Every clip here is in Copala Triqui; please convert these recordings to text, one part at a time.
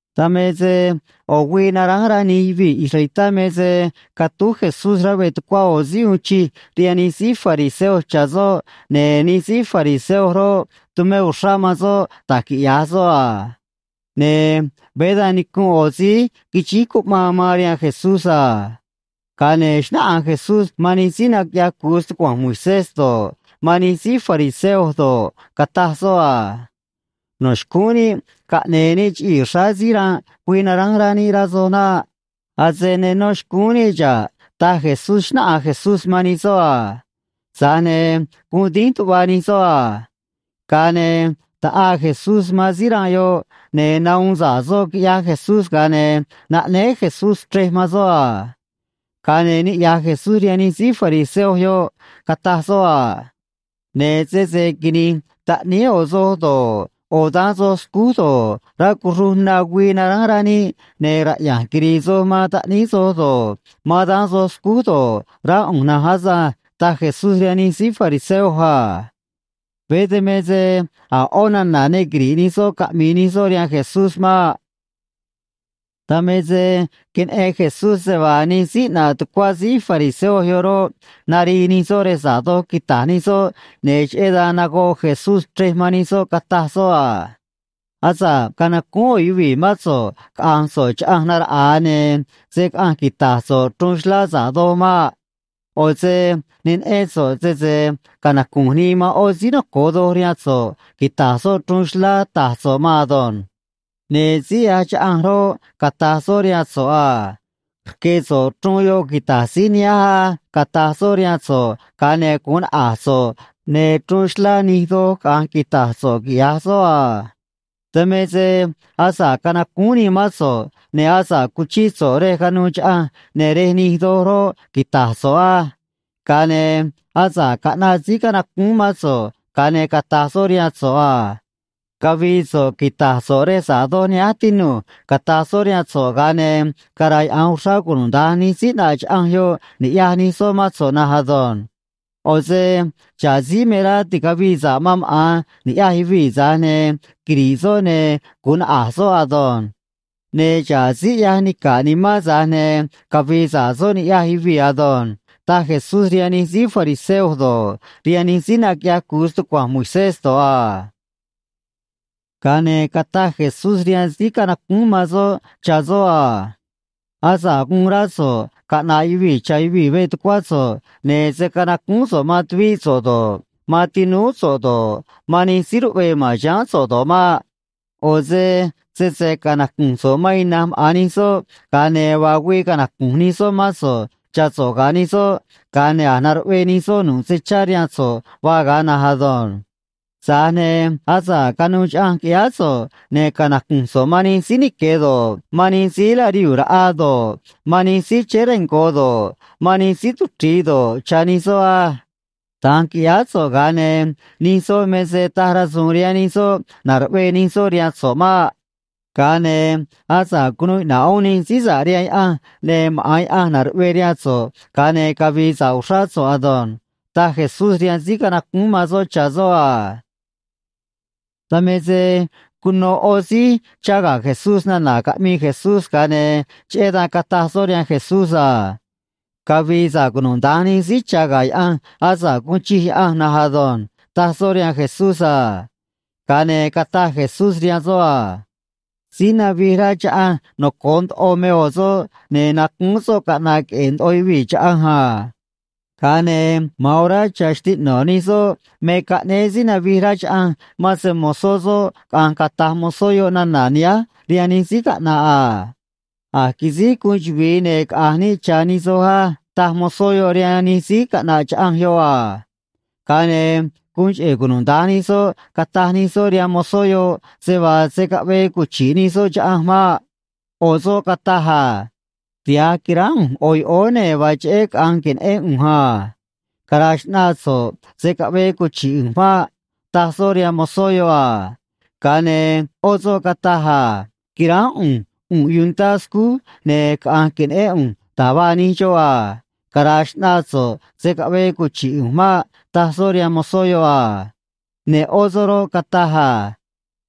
Dan me se ꞌo̱ güii naránj rá nij yuvii̱ israelitá me se catúj Jesús rá veꞌ tucuá ꞌo̱ síí uun chij rihaan nij síí fariseo cha̱ soꞌ, ne̱ nij síí fariseo roꞌ, tumé uxrá man soꞌ da̱j quiꞌya̱j soꞌ a. Ne̱ veé da̱nj nicu̱nꞌ ꞌo̱ síí quixíj cuꞌmaan man rihaan Jesús a. Ga̱a ne̱ xnáꞌanj Jesús man nij síí naquiꞌyaj cu̱u stucua̱nj Moisés do̱ꞌ, man nij síí fariseo do̱ꞌ, cataj soꞌ a: ―No̱ xcúún níꞌ caꞌne̱e̱ níꞌ chiꞌii̱ xráá síí ranꞌ güii naránj rá níꞌ, rá soj naꞌ. Ase ne nó xcúún níꞌ xa̱ꞌ ―taj Jesús, xnáꞌanj Jesús man nij soꞌ a. Tza̱j ne̱ guun dínj tuꞌva nij soꞌ a. Ga̱a ne̱ taꞌaa Jesús man síí ranꞌ yoꞌ, ne̱ nahuun sa̱ꞌ soꞌ, quiꞌyaj Jesús, ga̱a ne̱ naꞌnéé Jesús chrej man soꞌ a. Ga̱a ne̱ niꞌya̱j Jesús rihaan nij síí fariseo yoꞌ, cataj soꞌ a: ―Ne̱ sese quini̱j taꞌníí ꞌo̱ soj do̱ꞌ, ꞌo̱ daán soj scúj do̱ꞌ, rá cuxruj na güii naránj rá níꞌ, ne̱ raꞌya̱nj quiri̱i̱ soj man taꞌníí soj do̱ꞌ, man daán soj scúj do̱ꞌ, rá ꞌu̱nj na̱nj asânj ―taj Jesús rihaan nij síí fariseo a. Veé dan me se a̱ ꞌó nana̱ ne quiri̱ꞌ nij soꞌ caꞌmi̱i̱ nij soꞌ rihaan Jesús maꞌ. Dan me se queneꞌen Jesús se vaa nij síí ꞌnaꞌ tucuá síí fariseo yoꞌ roꞌ, narii nij soꞌ rej sa̱ꞌ doj quita̱j nij soꞌ, ne̱ cheꞌé dan nagoꞌ Jesús chrej man nij soꞌ, cataj soꞌ a: ―Asa̱ꞌ canacúún ꞌo̱ yuvii̱ mán so̱ꞌ caꞌa̱nj so̱ꞌ chaꞌanj naraꞌa̱a, ne̱ se̱ caꞌanj quita̱j so̱ꞌ chruun xlá sa̱ꞌ doj maꞌ. ꞌO̱ se ne neꞌén so̱ꞌ sese canacu̱nj nii man ꞌó síí noco̱o doj rihaan so̱ꞌ quita̱j soꞌ chruun xlá ta̱j so̱ꞌ maan ado̱nj. Ne̱ síí ꞌyaj chaꞌanj roꞌ, cata̱j soꞌ rihaan so̱ꞌ a: “Rque̱ so̱ꞌ chruun yoꞌ quita̱j síí nihánj á”, cata̱j soꞌ rihaan so̱ꞌ, ga̱a ne̱ gu̱un naꞌa̱j so̱ꞌ, ne̱ chruun xlá nij doj caꞌa̱nj quita̱j so̱ꞌ, quiꞌya̱j soꞌ a. Dan me se asa̱ꞌ canacúún nii mán so̱ꞌ, ne̱ asa̱ꞌ cuchíꞌ so̱ꞌ rej ca̱nuû chaꞌanj, ne̱ rej nij doj roꞌ, quita̱j so̱ꞌ á. Ga̱a ne̱ asa̱ꞌ caꞌnaꞌ síí canacúún mán so̱ꞌ, ga̱a ne̱ cata̱j soꞌ rihaan so̱ꞌ a: “Cavi̱i̱ so̱ꞌ quita̱j so̱ꞌ rej sa̱ꞌ doj nihánj, tinu̱j”, cata̱j soꞌ rihaan so̱ꞌ, ga̱a ne̱ cara̱yaꞌa̱nj uxrá cunuda̱nj nij síí ꞌnaꞌ chaꞌanj yoꞌ ni̱ꞌyaj nij soꞌ mán so̱ꞌ na̱nj ado̱nj. ꞌO̱ se xa̱ꞌ síí me rá ti̱cavii sa̱ꞌ man maꞌa̱n ni̱ꞌyaj yuvii̱, tza̱j ne̱ quiri̱ꞌ soꞌ, ne̱ gu̱un naꞌa̱j soꞌ ado̱nj. Ne̱ xa̱ꞌ síí ꞌyaj nica̱ꞌ nimán, tza̱j ne̱ cavi̱i̱ sa̱ꞌ soꞌ ni̱ꞌyaj yuvii̱ ado̱nj ―taj Jesús rihaan nij síí fariseo do̱ꞌ, rihaan nij síí naquiꞌyaj cu̱u stucua̱nj Moisés do̱ꞌ a. Ga̱a ne̱ cataj Jesús rihaan síí canacúún man soꞌ cha̱ soꞌ a: ―Asa̱ꞌ guun rá so̱ꞌ caꞌna̱ꞌ yuvii̱ cha̱ yuvii̱ veꞌ tucuá so̱ꞌ, ne̱ se̱ canacúún so̱ꞌ man tuvíꞌ so̱ꞌ do̱ꞌ, man tinúú so̱ꞌ do̱ꞌ, man nij síí ruꞌvee ma̱n chiháán so̱ꞌ do̱ꞌ maꞌ. ꞌO̱ se sese canacu̱nj so̱ꞌ man ina̱nj maꞌa̱n nij soꞌ, ga̱a ne̱ vaa güii canacu̱nj nij soꞌ mán so̱ꞌ cha̱ so̱ꞌ ga̱ nij soꞌ, ga̱a ne̱ a̱j naruꞌvee nij soꞌ nu̱ꞌ se chá rihaan so̱ꞌ vaa ga̱a na̱nj ado̱nj. Tza̱j ne̱ asa̱ꞌ canuû chaꞌanj qui̱ꞌyáá so̱ꞌ, ne̱ canacu̱nj so̱ꞌ man nij síí nique̱ do̱ꞌ, man nij síí larihuu̱ raꞌa do̱ꞌ, man nij síí chéé rengo̱ do̱ꞌ, man nij síí tuchri̱i do̱ꞌ, cha̱ nij soꞌ á. Da̱nj qui̱ꞌyáá so̱ꞌ, ga̱a ne̱ nij soꞌ me se taj rasu̱u̱n rihaan nij soꞌ na̱ruꞌvee nij soꞌ rihaan so̱ꞌ maꞌ. Ga̱a ne̱ asa̱ꞌ cunuu iꞌna̱ꞌ uún nij síí sa̱ꞌ rihaan Yaꞌanj, ne̱ maꞌa̱n Yaꞌanj na̱ruꞌvee rihaan so̱ꞌ, ga̱a ne̱ cavi̱i̱ sa̱ꞌ uxrá so̱ꞌ ado̱nj ―taj Jesús rihaan síí canacúún man soꞌ cha̱ soꞌ a. Dan me se cuno ꞌo̱ síí chá ga̱ Jesús nana̱ caꞌmii Jesús, ga̱a ne̱ cheꞌé dan cataj soꞌ rihaan Jesús a: ―Cavi̱i̱ sa̱ꞌ cunuda̱nj nij síí cha̱ ga̱ Yaꞌanj asa̱ꞌ guun chij Yaꞌanj na̱nj ado̱nj ―taj soꞌ rihaan Jesús a. Ga̱a ne̱ cataj Jesús rihaan soꞌ a: ―Síí navij rá chaꞌanj noco̱o ndoꞌo me ꞌo̱ soꞌ, ne̱ nacúún soꞌ caꞌna̱ꞌ queꞌe̱e̱ ndoꞌo yuvii̱ chaꞌanj a. Ga̱a ne̱ ma̱an orá cha̱ xtiꞌno̱ nij soꞌ me caꞌnéé síí navij rá chaꞌanj man se‑mo̱zó soꞌ caꞌa̱nj cata̱j mozó yoꞌ nana̱ nihánj rihaan nij síí caꞌna̱ꞌ a. “A̱j quisíj guun chuvi̱i, ne̱ caꞌa̱nj níꞌ cha̱ nij soj á”, taj mozó yoꞌ rihaan nij síí caꞌna̱ꞌ chaꞌanj yoꞌ a. Ga̱a ne̱ guun cheꞌe̱ cunuda̱nj nij soꞌ cataj nij soꞌ rihaan mozó yoꞌ se vaa se̱ caꞌvee cuchi̱ꞌ nij soꞌ chaꞌanj maꞌ. ꞌO̱ soꞌ cataj a: “Tiha̱j quiránj ꞌu̱nj ꞌo̱ yoꞌóó, ne̱ vaa cheꞌé caꞌa̱nj que̱neꞌén ꞌu̱nj a. Cara̱a̱ xꞌnaa so̱ꞌ, se̱ caꞌvee cuchi̱ꞌ ꞌu̱nj maꞌ”, taj soꞌ rihaan mozó yoꞌ a. Ga̱a ne̱ ꞌó soꞌ cataj a: “Quiránj ꞌu̱nj ꞌu̱nꞌ yuntá scúj, ne̱ caꞌa̱nj que̱neꞌén ꞌu̱nj da̱j vaa nij xoꞌ a. Cara̱a̱ xꞌnaa so̱ꞌ, se̱ caꞌvee cuchi̱ꞌ ꞌu̱nj maꞌ”, taj soꞌ rihaan mozó yoꞌ a. Ne̱ ꞌó soꞌ roꞌ, cataj a: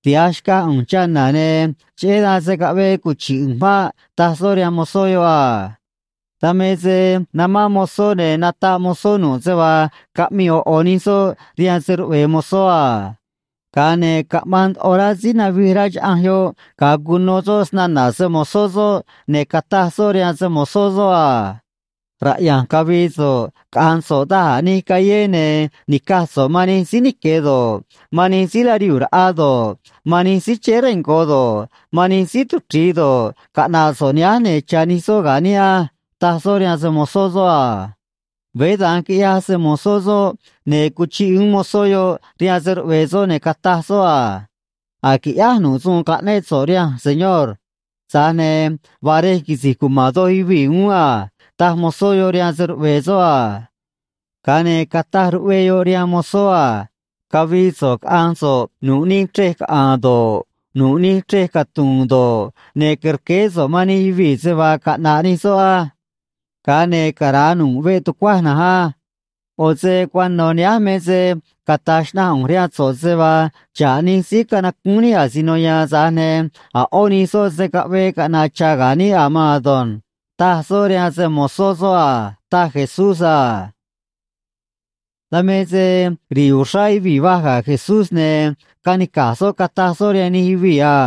“Tiha̱j xcaj ꞌu̱nj chana̱, ne̱ cheꞌé dan se̱ caꞌvee cuchi̱ꞌ ꞌu̱nj maꞌ”, taj soꞌ rihaan mozó yoꞌ a. ’Dan me se namán mozó, ne̱ nataꞌ mozó nu̱ꞌ se vaa caꞌmii ꞌo̱ ꞌo̱ nij soꞌ rihaan se‑ruꞌve̱e̱ mozó a. Ga̱a ne̱ caꞌmaan ndoꞌo rá síí navij rá chaꞌanj yoꞌ ga̱a cuno soꞌ snana̱ se‑mo̱zó soꞌ, ne̱ cataj soꞌ rihaan se‑mo̱zó soꞌ a: “Raꞌya̱nj cavi̱i̱ so̱ꞌ caꞌa̱nj so̱ꞌ da̱j a̱ nij callé, ne̱ ni̱caj so̱ꞌ man nij síí nique̱ do̱ꞌ, man nij síí larihuu̱ raꞌa do̱ꞌ, man nij síí chéé rengo̱ do̱ꞌ, man nij síí tuchri̱i do̱ꞌ, caꞌna̱ꞌ so̱ꞌ nihánj, ne̱ cha̱ nij soꞌ ga̱ níꞌ á”, taj soꞌ rihaan se‑mo̱zó soꞌ a. Veé da̱nj quiꞌyaj se‑mo̱zó soꞌ, ne̱ cuchiꞌ uún mozó yoꞌ rihaan se‑ruꞌve̱e̱ soꞌ, ne̱ cataj soꞌ a: “A̱j quiꞌyáj nu̱ꞌ suun caꞌnéꞌ so̱ꞌ rihanj, señor. Tza̱j ne̱ vaa rej quisi̱j cuma̱n doj yuvii̱ uún a”, taj mozó yoꞌ rihaan se‑ruꞌve̱e̱ soꞌ a. Ga̱a ne̱ cataj ruꞌvee yoꞌ rihaan mozó a: “Cavi̱i̱ so̱ꞌ caꞌa̱nj so̱ꞌ nu̱ꞌ nij chrej caꞌa̱a̱n do̱ꞌ, nu̱ꞌ nij chrej catu̱u̱n do̱ꞌ, ne̱ que̱rqueé so̱ꞌ man nij yuvii̱ se vaa caꞌna̱ꞌ nij soꞌ á. Ga̱a ne̱ cara̱a nu̱ꞌ veꞌ tucuaj na̱nj á. ꞌO̱ se cuano̱ nihánj me se cata̱j xnaꞌanj ꞌu̱nj rihaan so̱ꞌ se vaa xa̱ꞌ nij síí canacúún níꞌ asino ya̱a̱n, tza̱j ne̱ a̱ ꞌó nij soꞌ se̱ caꞌvee caꞌna̱ꞌ cha̱ ga̱ níꞌ a̱ maan ado̱nj”, taj soꞌ rihaan se‑mo̱zó soꞌ a ―taj Jesús a. Dan me se ri̱i̱ uxrá yuvii̱ vaj ga̱ Jesús, ne̱ canica̱j soꞌ, cataj soꞌ rihaan nij yuvii̱ a: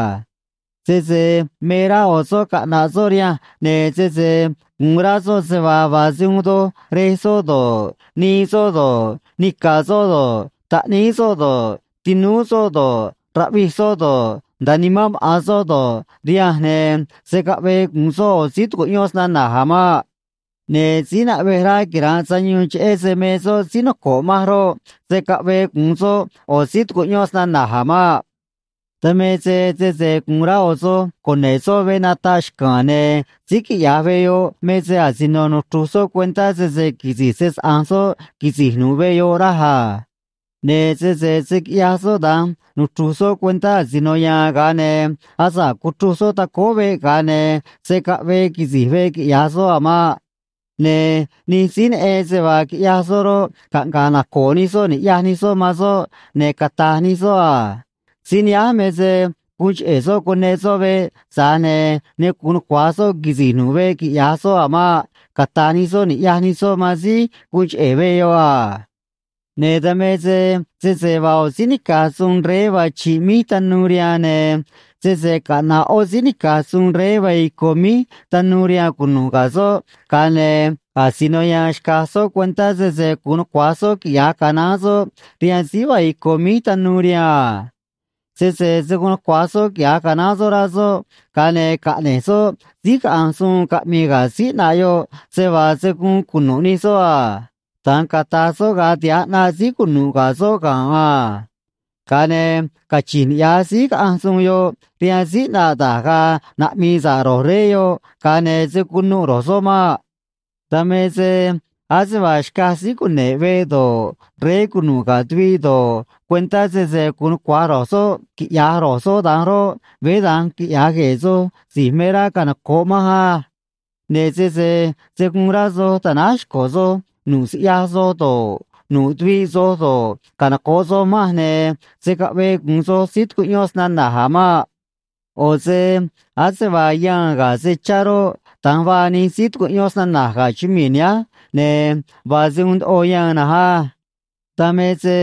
―Sese me rá ꞌo̱ soꞌ caꞌna̱ꞌ soꞌ rihanj, ne̱ sese gu̱un rá soꞌ se vaa vaa se uun doj rej soꞌ do̱ꞌ, nii soꞌ do̱ꞌ, nica̱ soꞌ do̱ꞌ, taꞌníí soꞌ do̱ꞌ, tinúú soꞌ do̱ꞌ, raꞌvij soꞌ do̱ꞌ, nda̱a nimán maꞌa̱n soꞌ do̱ꞌ, rihanj, ne̱ se̱ caꞌvee gu̱un soꞌ ꞌo̱ síí tucuꞌyón snana̱j a̱ maꞌ. Ne̱ síí naꞌvej rá quira̱nꞌ sayuun cheꞌé se me soꞌ síí noco̱ꞌ manj roꞌ, se̱ caꞌvee gu̱un soꞌ ꞌo̱ síí tucuꞌyón snana̱j a̱ maꞌ. ’Dan me se sese gu̱un rá ꞌo̱ soj cune̱ꞌ soꞌ veꞌ nataꞌ xca̱a̱n, ne̱ síí quiꞌya̱j veꞌ yoꞌ me se asino nuchru̱j soꞌ cuentá sese quisi̱j se‑saꞌa̱nj soꞌ quisi̱j nu̱ꞌ veꞌ yoꞌ, raj a. Ne̱ sese se̱ quiꞌyaj soꞌ da̱nj nuchru̱j soꞌ cuentá asino ya̱a̱n, ga̱a ne̱ asa̱ꞌ cuchruj soꞌ tacóó veꞌ, ga̱a ne̱ se̱ caꞌvee quisi̱j veꞌ quiꞌya̱j soꞌ a̱ maꞌ. Ne̱ nij síí neꞌen se vaa quiꞌyaj soꞌ roꞌ, caꞌnga̱ꞌ naco̱o̱ nij soꞌ ni̱ꞌyaj nij soꞌ man soꞌ, ne̱ cata̱j nij soꞌ a: “Síí nihánj me se guun cheꞌe̱ soꞌ cuneꞌ soꞌ veꞌ, tza̱j ne̱ ne gu̱un nucua̱j soꞌ quisi̱j nu̱ꞌ veꞌ quiꞌya̱j soꞌ a̱ maꞌ”, cata̱j nij soꞌ ni̱ꞌyaj nij soꞌ man síí guun cheꞌe̱ veꞌ yoꞌ a. ’Ne̱ dan me se sese vaa ꞌo̱ síí nica̱j suun rey vaa chi̱ꞌ míj tanuu rihaan, ne̱ sese caꞌna̱ꞌ ꞌó síí nica̱j suun rey vaa ico̱ míj tanuu rihaan cunu̱ꞌ ga̱ soꞌ, ga̱a ne̱ asino ya̱a̱n xca̱j soꞌ cuentá sese gu̱un nucua̱j soꞌ quiꞌya̱j canaán soꞌ rihaan síí vaa ico̱ míj tanuu rihaan a. Sese se̱ guun nucua̱j soꞌ quiꞌya̱j canaán soꞌ rá soꞌ, ga̱a ne̱ caꞌne̱j soꞌ síí caꞌanj suun caꞌmi̱i̱ ga̱ síí ꞌnaꞌ yoꞌ se vaa se̱ guun cunu̱ꞌ nij soꞌ a. Da̱nj cata̱j soꞌ ga̱a tiha̱j ꞌnaꞌ síí cunu̱ꞌ ga̱ soꞌ ga̱nꞌ a. Ga̱a ne̱ cachi̱nj niꞌya̱j síí caꞌanj suun yoꞌ rihaan síí ꞌnaꞌ, da̱j ga̱a̱ naꞌmi̱i̱ sa̱ꞌ ro̱j rey yoꞌ ga̱a ne̱ se̱ cunuꞌ ro̱j soꞌ maꞌ. ’Dan me se ase vaa xcaj síí cune̱ꞌ veꞌ do̱ꞌ, rey cunu̱ꞌ ga̱ tuviꞌ do̱ꞌ, cuentá sese gu̱un nucua̱j ro̱j soꞌ quiꞌya̱j ro̱j soꞌ da̱nj roꞌ, veé da̱nj quiꞌya̱j gue̱e̱ soj si̱j me rá canoco̱ꞌ manj á. Ne̱ sese se̱ guun rá soj ta̱náj xco̱ soj nu̱ꞌ siꞌyaj soj do̱ꞌ, nu̱ꞌ tuviꞌ soj do̱ꞌ, canoco̱ꞌ soj manj, ne̱ se̱ caꞌvee gu̱un soj síí tucuꞌyón snana̱j a̱ maꞌ. ’ꞌO̱ se ase vaa yaan ga̱ se chá roꞌ, da̱nj vaa nij síí tucuꞌyón snana̱j ga̱ chumii̱ nihánj, ne̱ vaa se uun ndoꞌo yaan na̱nj á. Dan me se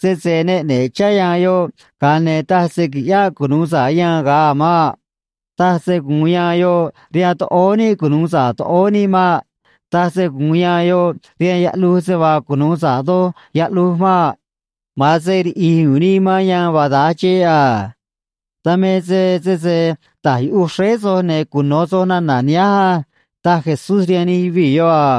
sese ne ꞌne̱ꞌ chá yaan yoꞌ, ga̱a ne̱ taj se qui̱ꞌyáꞌ cunu̱u sa̱ꞌ yaan ga̱a a̱ maꞌ. Taj se gu̱un yaan yoꞌ rihaan toꞌóó níꞌ cunu̱u sa̱ꞌ toꞌóó níꞌ maꞌ. Taj se gu̱un yaan yoꞌ rihaan yaꞌluj se vaa cunu̱u sa̱ꞌ doj yaꞌluj maꞌ. Ma̱an se riꞌi̱j u̱u̱n nii man yaan vaa da̱nj xeꞌ a. ’Dan me se sese ta̱j yuꞌuj xréé soj, ne̱ cuno̱ soj nana̱ nihánj á ―taj Jesús rihaan nij yuvii̱ yoꞌ a.